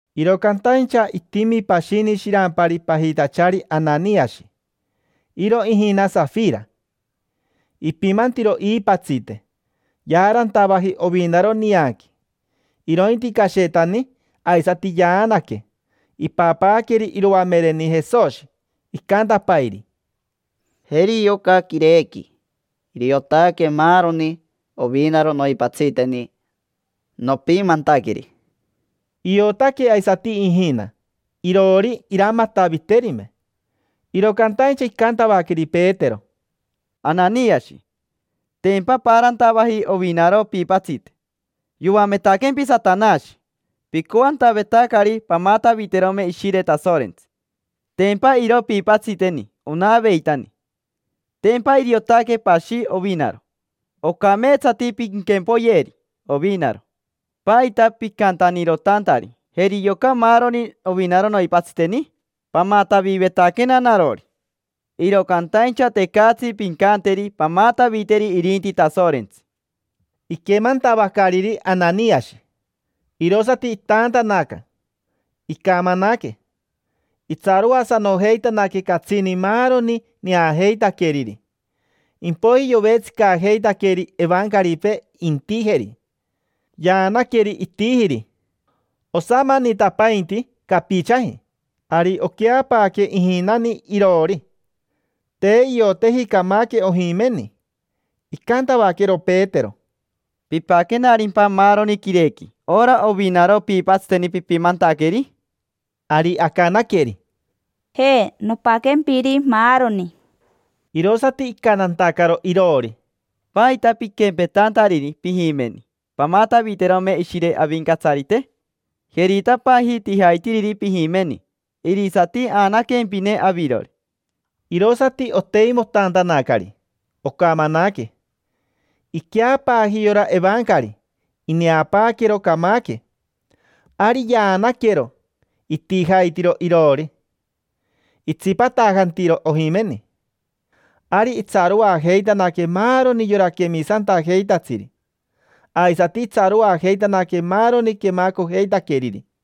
Iro cantaincha itimi pashini shirampari pajitachari Ananiashi, iro ijina Sajira. Ipimantiro iipatsite, yaarantavaji ovinaro nianqui. Irointi cashetani aisati yaanaque, ipapaaqueri iroamereni Jesoshi. Icantapairi: —Jeri yoca quirequi, iriotaque maaroni ovinaro noipatsiteni nopimantaqueri. Iotaque aisati ijina iroori iramataviterime. Iro cantaincha icantavaqueri Petero: —Ananiashi, tempa paarantavaji ovinaro piipatsite. Yoametaquempi Satanashi, picoantavetacari pamataviterome Ishire Tasorentsi. Tempa iro piipatsiteni onaveitani, tempa iriotaque pashi ovinaro. Ocameetsati pinquempoyeri ovinaro. ¿Paita picantanirotantari: “Jeri yoca maaroni ovinaro noipatsiteni”? Pamatavivetaquena narori, iro cantaincha tecatsi pincanteri pamataviteri irinti Tasorentsi. Iquemantavacariri Ananiashi, irosati itaantanaca, poron. Icamanaque, toren. Itsaroasanojeitanaque catsini maaroni neajeitaqueriri. Impoiji yovetsicajeitaqueri evancaripee intijeri; yaanaqueri, itijiri. Osamanitapainti capichaji, ari oqueapaaque ijinani iroori. Te ioteji camaque ojimeni. Icantavaquero Petero: —¿Pipaquenarimpa maaroni quirequi, ora ovinaro piipatsiteni pipimantaqueri? Ari acanaqueri: —Je, nopaquempiri maaroni. Irosati icantantacaro iroori: —¿Paita piquempetantariri pijimeni, pamataviterome Ishire Avincatsarite? Jeritapaaji tijaitiriri pijimeni: irisati aanaquempine avirori. Irosati oteimotantanacari, ocamanaque. Iqueapaaji yora evancari, ineapaaquero, camaque. Ari yaanaquero, itijaitiro iroori, itsipatajantiro ojimeni. Ari itsaroajeitanaque maaroni yora quemisantajeitatsiri, aisati itsaroajeitanaque maaroni quemacojeitaqueriri.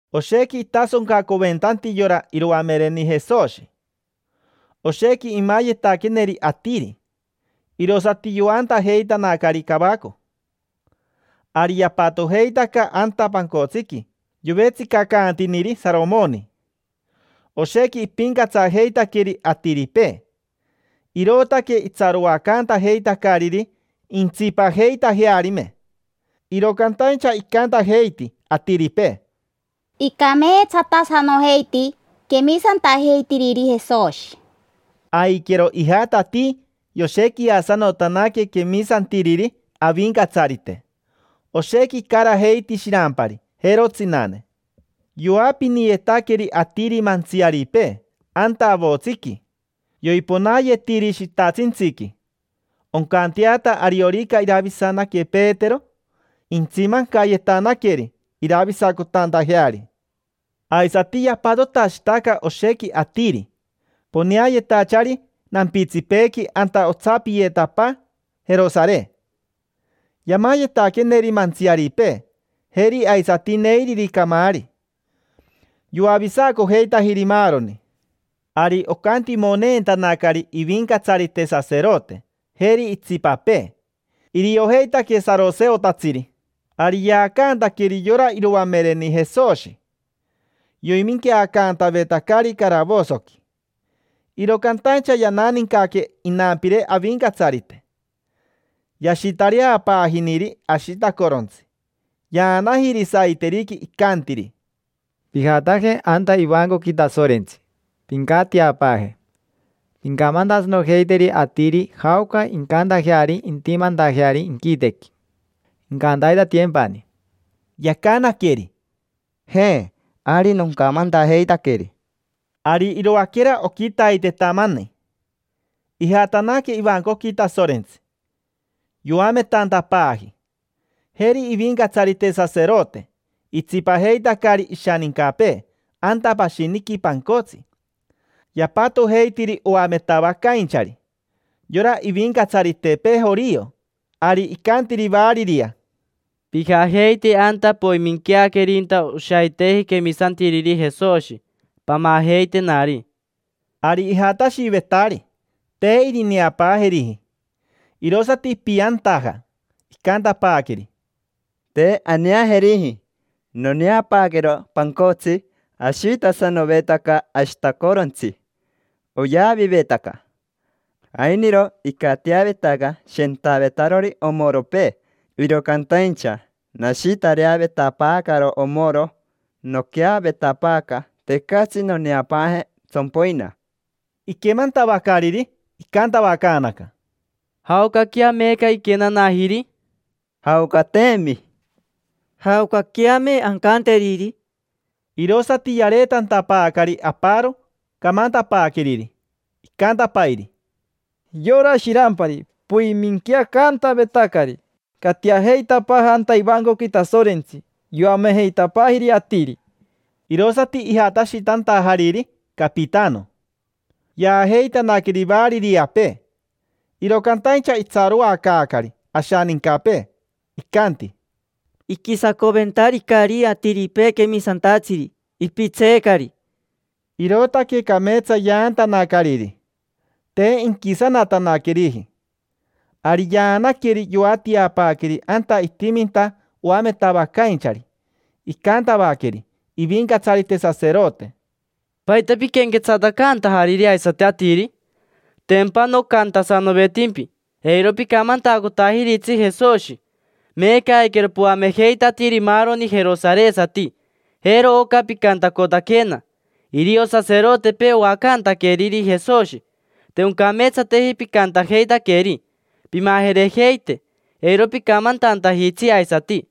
Oshequi itasoncaventanti yora iroamereni Jesoshi. Oshequi imayetaqueneri atiri, irosati yoantajeitanacari cavaco. Ari yapatojeitaca anta pancotsiqui yovetsicacantiniri Saromoni. Oshequi ipincatsajeitaqueri atiripee, irootaque itsaroacantajeitacariri intsipajeitajearime. Iro cantaincha icantajeiti atiripee: —Icameetsatasanojeiti quemisantajeitiriri Jesoshi. Aiquero ijatatii yoshequiasanotanaque quemisantiriri Avincatsarite. Oshequi icarajeiti shirampari, jero tsinane. Yoapiniyetaqueri atiri mantsiaripee anta avotsiqui: yoiponaayetiri shitashintsiqui, oncanteata ariorica iravisanaque Petero, intsimancayetanaqueri iravisacotantajeari. Aisati yapatotashitaca oshequi atiri, poneayetachari nampitsipeequi anta otsapiyetapaa Jerosare. Yamayetaqueneri mantsiaripee, jeri aisati neiriri camaari. Yoavisacojeitajiri maaroni. Ari ocantimoneentanacari ivincatsarite saserote, jeri itsipapee: iriojeitaque saroseotatsiri. Ari yaacantaqueri yora iroamereni Jesoshi, yoiminqueacantavetacari caravosoqui. Iro cantaincha yananincaque inampire Avincatsarite, yashitareapaajiniri ashitacorontsi, yaanajiri saiteriqui. Icantiri: —Pijataje anta ivancoqui Tasorentsi, pincatiapaaje. Pincamantasanojeiteri atiri jaoca incantajeari intimantajeari inquitequi, incantaitatiyempani. Yacanaqueri: —Je, ari noncamantajeitaqueri. Ari iroaquera oquitaitetamani ijatanaque ivancoqui Tasorentsi, yoametantapaaji. Jeri ivincatsarite saserote, itsipajeitacari ishanincapee anta pashiniqui pancotsi. Yapatojeitiri oametavacainchari: yora ivincatsaritepee jorio. Ari icantiri variria: —Pijajeite anta poiminqueaquerinta oshaiteji quemisantiriri Jesoshi, pamajeitenari. Ari ijatashivetari, te irineapaajeriji. Irosati ipiantaja, icantapaaqueri: —Te aneajeriji. Noneapaaquero pancotsi, ashitasanovetaca ashitacorontsi, oyavivetaca. Ainiro icatiavetaca shentavetarori omoropee. Iro cantaincha nashitareavetapaacaro omoro, noquea vetapaaca; tecatsi noneapaaje tsompoina. Iquemantavacariri, icantavacaanaca: —¿Jaocaquea meeca iquenanajiri? —Jaocateemi. —¿Jaocaqueame ancanteriri? Irosati yareetantapaacari aparo camantapaaqueriri, icantapairi: —Yora shirampari poiminqueacantavetacari, catiajeitapaaja anta ivancoqui Tasorentsi. Yoamejeitapaajiri atiri. Irosati ijatashitantajariri capitano, yaajeitanaqueri variriapee, iro cantaincha itsaroacaacari ashanincapee; icanti: —Iquisacoventaricari atiripee quemisantatsiri, ipitseecari. Irootaque cameetsa yaantanacariri, te inquisanatanaqueriji. Ari yaanaqueri, yoatiapaaqueri anta itiminta oametavacainchari. Icantavaqueri ivincatsarite saserote: —¿Paita piquenquetsatacantajariri aisati atiri? Tempa nocantasanovetimpi: “Eiro picamantacotajiritsi Jesoshi”. Meeca aiquero poamejeitatiiri maaroni jerosaresati. Jero oca picantacotaquena: “Irio saserotepee oacantaqueriri Jesoshi”. Te oncameetsateji picantajeitaqueri. Pimajerejeite, eiro picamantantajitsi aisati.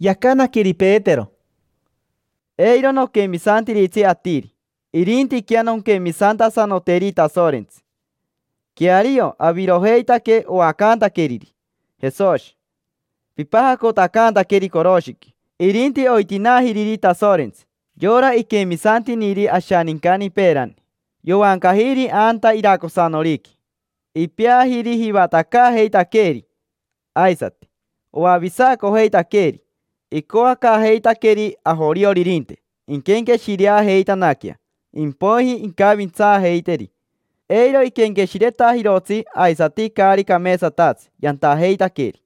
Yacanaqueri Petero: —Eiro noquemisantiritsi atiri, irintiquea nonquemisantasanoteri Tasorentsi. Queario avirojeitaque oacantaqueriri Jesoshi. Pipajacotacantaqueri coroshiqui. Irinti oitinaajiriri Tasorentsi, yora iquemisantiniri ashanincani peerani. Yoancajiri anta iracosanoriqui. Ipeajiri Jivatacaajeitaqueeri, aisati Oavisacojeitaqueeri. Icoacaajeitaqueri ajorioririnte inquenqueshirejeitanaquea, impoiji incavintsaajeiteri, eiro iquenqueshiretajirotsi aisati caari cameetsatatsi yantajeitaqueri.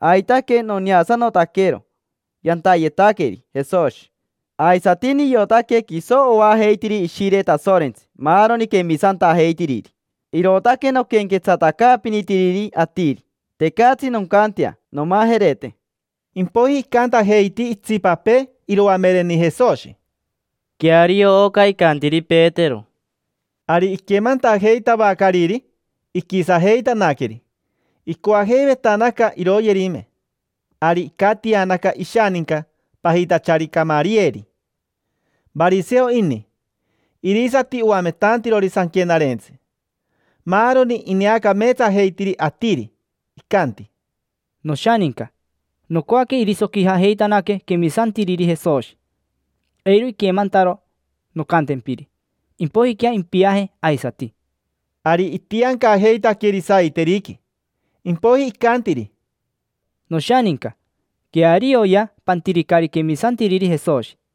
Aitaque noneasanotaquero yantayetaqueri Jesoshi, aisati niotaque quiso oajeitiri Ishire Tasorentsi maaroni quemisantajeitiriri. Irootaque noquenquetsatacaapinitiriri atiri. Tecatsi noncantea nomajerete. Impoiji icantajeiti itsipapee iroamereni Jesoshi: —Queario oca icantiri Petero. Ari iquemantajeitavacariri, iquisajeitanaqueri, icoajeivetanaca iroyerime. Ari icatianaca ishaninca pajitachari Camariyeri. Variseo ini, irisati oametantirori sanquenarentsi. Maaroni ineacameetsajeitiri atiri. Icanti: —Noshaninca, nocoaque irisoquijajeitanaque quemisantiriri Jesoshi, eiro iquemantaro noncantempiri. Impoijiquea impiaje aisati. Ari itiancajeitaqueri saiteriqui. Impoiji icantiri: —Noshaninca. Quearioya, pantiricari quemisantiriri Jesoshi.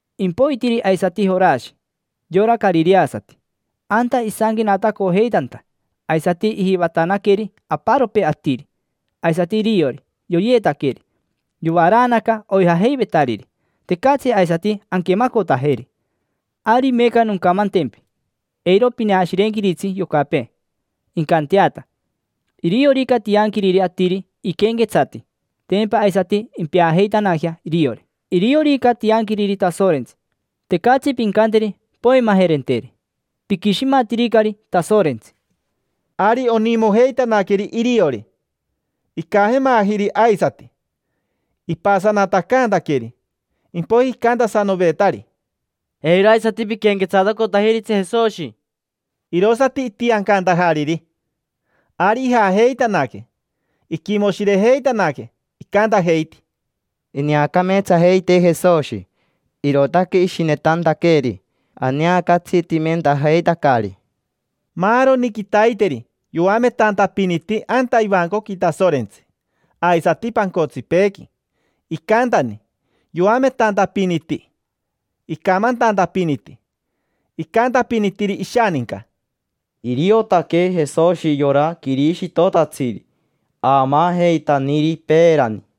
Impoitiri aisati Jorashi, yora carireasati. Anta isanquenatacojeitanta, aisati ijivatanaqueri aparopee atiri. Aisati iriori, yoyeetaqueri. Yovaraanaca oijajeivetariri, tecatsi aisati anquemacotajeri. Ari meeca noncamantempi, eiro pineashirenquiritsi yocapee, incanteata. Iriorica tianquiriri atiri iquenquetsati, tempa aisati impeajeitanajea iriori. Iriorica tianquiriri Tasorentsi, tecatsi pincanteri poimajerenteri. Piquishimatiricari Tasorentsi. Ari onimojeitanaqueri iriori. Icajemajiri aisati, ipasanatacaantaqueri. Impoiji icantasanovetari: —Eiro aisati piquenquetsatacotajiritsi Jesoshi. Irosati itiancantajariri. Ari ijajeitanaque, Iquimoshirejeitanaque, icantajeiti: —Ineacameetsajeitee Jesoshi, irootaque ishinetantaqueeri aneacatsitimentajeitacari. Maaroni quitaiteri yoametantapiniti anta ivancoqui Tasorentsi, aisati pancotsipeequi. Icantani: yoametantapiniti, icamantantapiniti. Icantapinitiri ishaninca: —Iriotaque Jesoshi yora Quirishitotatsiri aamaajeitaniri peerani.